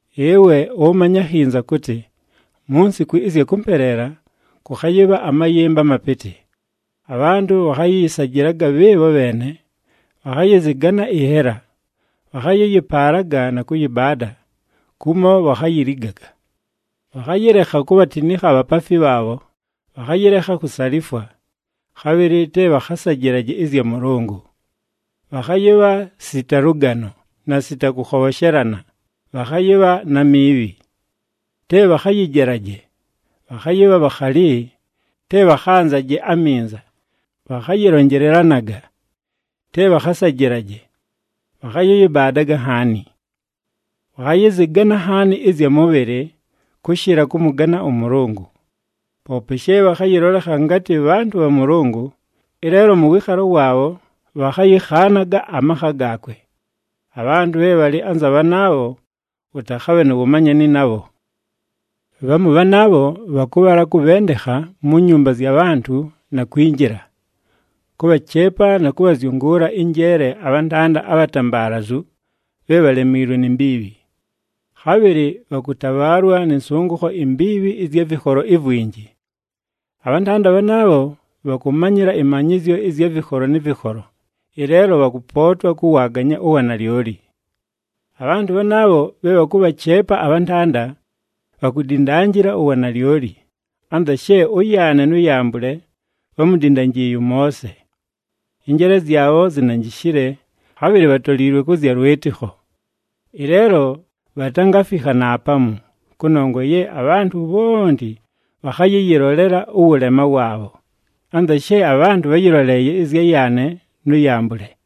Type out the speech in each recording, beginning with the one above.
Ɨwe ʉmanye akhinza kʉtɨ, mu nsiku ɨzya kʉmpeleela, kʉkhayɨbha amayɨmba amapɨtɨ. Abhantʉ bhakhayɨyɨsajɨlaga bhɨɨbho bheene, bhakhayɨzɨgana ɨnhela, bhakhayɨyɨpaalaga na kʉyɨbaada, kumo bhakhayiligaga. Bhakhayɨlekha kubhatinikha abhapaafi bhaabho, bhakhayɨlekha kusalifwa, khabhɨlɨ te bhakhasajɨlaje ɨzya Mʉlʉngʉ. Bhakhayɨbha sita lʉgano, na sita kʉkhobhoshelana, bhakhayɨbha na miibhi. Te bhakhayɨjelaje, bhakhayɨbha bhakhali, te bhakhaganzaje aminza, bhakhayɨlonjelelanaga, te bhakhasajɨlaje, bhakhayɨyɨbaadaga nhaani. Bhakhayɨzɨgana nhaani ɨzya mʉbhɨlɨ, kʉshɨla kʉmʉgana ʉMʉlʉngʉ. Poope she bhakhayɨlolekha ngatɨ bhantʉ bha Mʉlʉngʉ, ɨleelo mʉ wɨɨkhalo waabho bhakhayɨkhaanaga amakha gaakwe. Abhantʉ bhe bhalɨ anza bhanaabho, ʉtakhabhe nu wumanyani nabho. Bhamu bhanaabho bhakʉbhala kʉbhendekha mu nyumba zya bhantʉ na kwinjila, kʉbhacheepa na kʉbhazyʉngʉʉla ɨnjeele abhantanda abhatambaalazu bhe bhalemiilwe ni mbiibhi. Khabhɨlɨ bhakʉtabhaalwa nɨ nsʉngʉkho imbiibhi ɨzya vɨkholo ivwinji. Abhantanda bhanaabho, bhakʉmanyɨla ɨmanyɨzyo ɨzya vɨkholo nɨ vɨkholo, ɨleelo bhakʉpootwa kʉwaaganya uwanalyoli. Abhantʉ bhanaabho bhe bhakʉbhacheepa abhantanda, bhakudindanjila uwanalyoli, anza she ʉYaane nʉ Yambʉle bhámudindanjiiye ʉMoose. Ɨnjeele zyabho zinanjishile, khabhɨlɨ bhatoliilwe kʉ zya lwɨtɨkho. Ɨleelo bhatangafikha naapamu, kʉnongwa ye abhantʉ bhonti bhakhayɨyɨlolela ʉwʉlema waabho, anza she abhantʉ bháyɨloleeye ɨzya Yaane nʉ Yambʉle.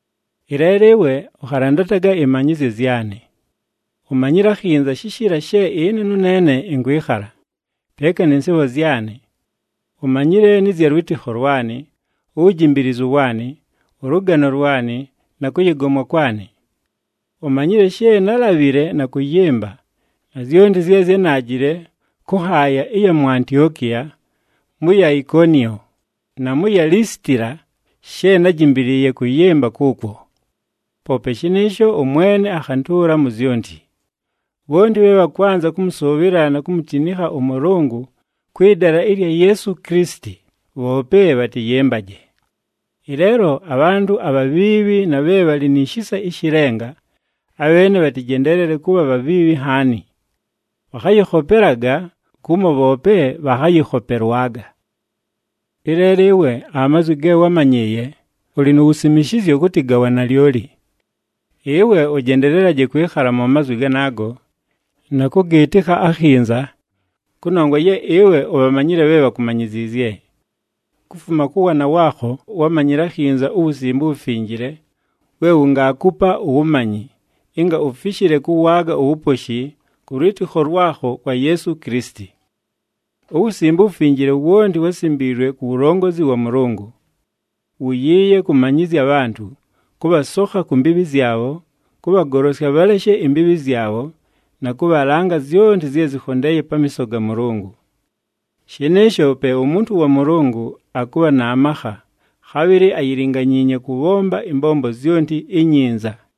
Ɨleelo ɨwe, ʉkhalandataga ɨmanyɨzyo zyanɨ. Umanyile akhinza shishiila she ɨne nʉneene ɨnkwɨkhala, peeka nɨ nsɨɨbho zyanɨ. Umanyile nɨ zya lwɨtɨkho lwanɨ, uwujimbiilizu waanɨ, ʉlʉgano lwanɨ, na kʉyɨgomwa kwanɨ. Umanyile she nálabhile na kʉyɨmba, na zyonti zye zyánaajile kʉ nhaaya ɨya mu Antiokiya, mʉ ya Ikoniyo, na mʉ ya Lisitila she nájimbiliiye kʉyɨmba kʉʉkwo. Poope shɨnɨɨsho, ʉMwene akhantʉʉla mu zyonti. Bhonti bhe bhakwanza kʉmʉsʉʉbhɨla na kumutinikha ʉMʉlʉngʉ kwɨ dala ɨlya Yeesu Kilisiti, bhoope bhatɨyɨmbaje. Ɨleelo abhantʉ abhabhiibhi na bhe bhalɨ ni shisa ɨshɨ lenga, abheene bhatɨjendeelele kʉbha bhabhiibhi nhaani. Bhakhayɨkhopelaga, kumo bhoope bhakhayɨkhopelwaga. Ɨleelo ɨwe amazwi ge wámanyɨɨye, ʉlɨ nu wusimishizyo kʉtɨ ga wanalyoli. Ɨwe ʉjendelelaje kwɨkhala mu mazwi ganaago, na kʉgɨɨtɨkha akhinza, kʉnongwa ye ɨwe ubhamanyile bhe bhakumanyiziizye. Kufuma kʉ waana waakho, wámanyile akhinza uWusimbe uWufinjile we wungaakupa uwumanyi, ɨnga ufishile kʉwaaga uwuposhi kʉ lwɨtɨkho lwakho kwa Yeesu Kilisiti. UWusimbe uWufinjile wonti wásimbiilwe ku wulongozi wa Mʉlʉngʉ. Wuyiiye kʉmanyɨzya abhantʉ, kʉbhasokha ku mbiibhi zyabho, kʉbhagolosya bhaleshe imbiibhi zyabho na kʉbhalanga zyonti zye zɨkhondeeye pamiiso ga Mʉlʉngʉ. Shɨnɨɨsho pe umuntu wa Mʉlʉngʉ akʉbha na makha, khabhɨlɨ ayilinganyiinye kʉbhomba ɨmbombo zyonti inyinza.